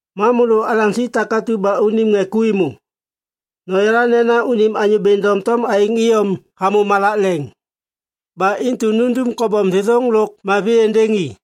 Ma môlô alaŋsi takatu ba unim ŋê ku êmô, noyala nena unim Anyô Bêŋ doŋtom aêŋ iyom hamô malak leŋ. Ba intu nundum kobom thêthôŋ lôk mavi êndêŋ i.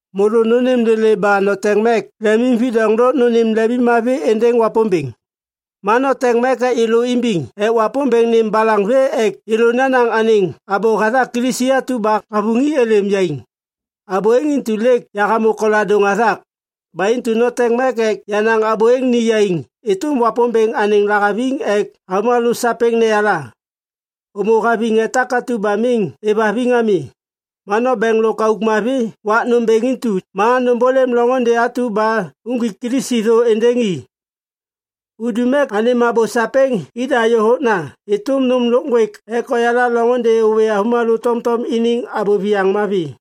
Môlô nônêm lêlê ba noteŋ mek lemimvidoŋ lôk nônêm lemimmavi êndêŋ Wapômbêŋ. Ma noteŋ mek ek yêlô imbiŋ ek Wapômbêŋ nêm balaŋ vê ek yêlô nanaŋ anêŋ abô hathak Kilisi atu ba havuŋi êlêm yaiŋ. Abô êŋ intu lêk yahamô koladôŋ hathak. Ba intu noteŋ mek ek yanaŋ abô êŋ ni yaiŋ êtôm Wapômbêŋ anêŋ lahaviŋ ek avômalô sapêŋ neyala. Ômô haviŋ ŋê takatu ba miŋ êvhaviŋ ami, ma nombeŋ lôk auk mavi wak nômbêŋ intu ma nômbôlêm loŋôndê atu ba nuŋgwik Kilisi thô êndêŋ i. Undum ek anêm abô sapêŋ ida yôhôkna êtôm nôm lôk ŋgwêk ek oyala loŋôndê ôwê avômalô tomtom iniŋ abô viyaŋ mavi.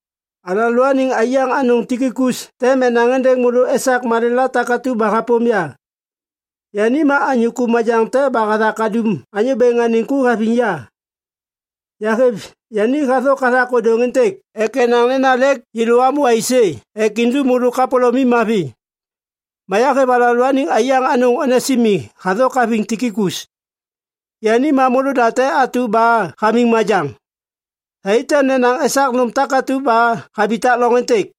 Alalôaniŋ aiyaŋ anôŋ Tikikus tem enaŋ êndêŋ môlô esak malêla takatu ba hapôm ya. Yani ma anyô ku majaŋ te ba hathak hadum Anyô Bêŋ anêŋ ku haviŋ ya. Yahêv yani hathôk hathak ôdôŋ êntêk ek enaŋ nena lêk yêlô amô aisê ek indum môlô kapôlômim mavi. Ma yahêv alalôaniŋ aiyaŋ anôŋ Onesimi hathôk haviŋ Tikikus. Yani ma môlôda te atu ba hamiŋ majaŋ. Thai tem nenaŋ esak nôm takatu ba habitak loŋ êntêk.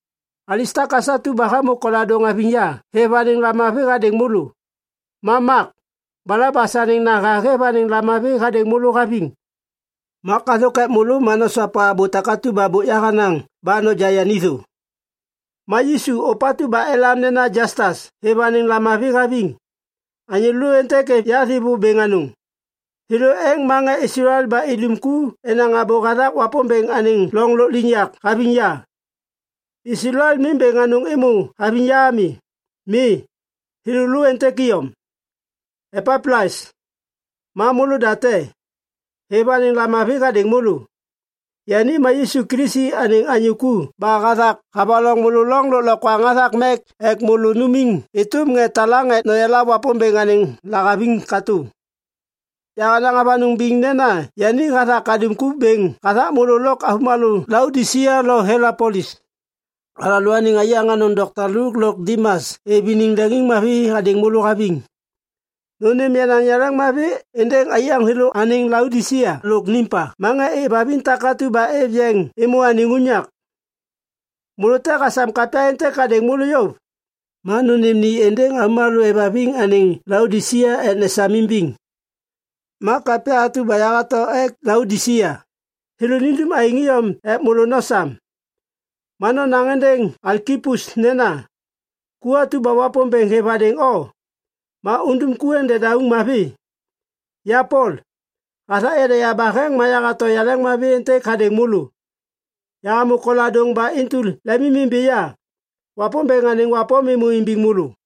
Alistakas atu ba hamô koladôŋ haviŋ ya hêv anêŋ lamavi hadêŋ môlô. Ma Mak, Balabas anêŋ naha hêv anêŋ lamavi hadêŋ môlô haviŋ. Mak hathôk ek môlô ma nosopa abô takatu ba bôk yahanaŋ ba noja yani thô. Ma Yisu ôpatu ba elam nena Jastas hêv anêŋ lamavi haviŋ. Anyô lô êntêk êv ya thêvô bêŋ anôŋ. Thêlô êŋ ma ŋê Islael ba idum ku enaŋ abô hathak Wapômbêŋ anêŋ loŋ lôkliŋyak haviŋ ya. Islael miŋ bêŋ anôŋ êmô haviŋ ya ami. Mi, thêlô lô êntêk iyom. Epaplas, ma môlôda te, hêv anêŋ lamavi hadêŋ môlô. Yani ma Yisu Kilisi anêŋ anyô ku ba hathak havaloŋ môlô loŋ lôklokwaŋ hathak mek ek môlô numiŋ êtôm ŋê talaŋ ek noyala Wapômbêŋ anêŋ lahaviŋ katô. Yahanaŋ avanôŋ biŋ nena yani hathak hadum ku bêŋ hathak môlô lôk avômalô Laodisia lo Hielapolis. Alalôaniŋ aiyaŋ anôŋ dokta Luk lôk Dimas êv iniŋ leŋiŋmavi hadêŋ môlô haviŋ. Nônêm yenaŋ yaleŋmavi êndêŋ aiyaŋ thêlô anêŋ Laodisia lôk Nimpa ma ŋê êvhaviŋ takatu ba êv yeŋ êmô anêŋ unyak. Môlô te hasam kapya êntêk hadêŋ môlô yôv, ma nônêm ni êndêŋ avômalô êvhaviŋ anêŋ Laodisia ek nesam imbiŋ. Ma kapya atu ba yahato ek Laodisia, thêlô nindum aêŋ iyom ek môlô nosam. Ma nonaŋ êndêŋ Alkipus nena, “Ku atu ba Wapômbêŋ hêv hadêŋ o, ma undum ku êŋ dedauŋ mavi.” Ya Pol, hathak yada yabaheŋ ma yahato yaleŋmavi êntêk hadêŋ môlô. Yahamô koladôŋ ba intu lemimimbi ya. Wapômbêŋ anêŋ wapôm êmô imbiŋ môlô.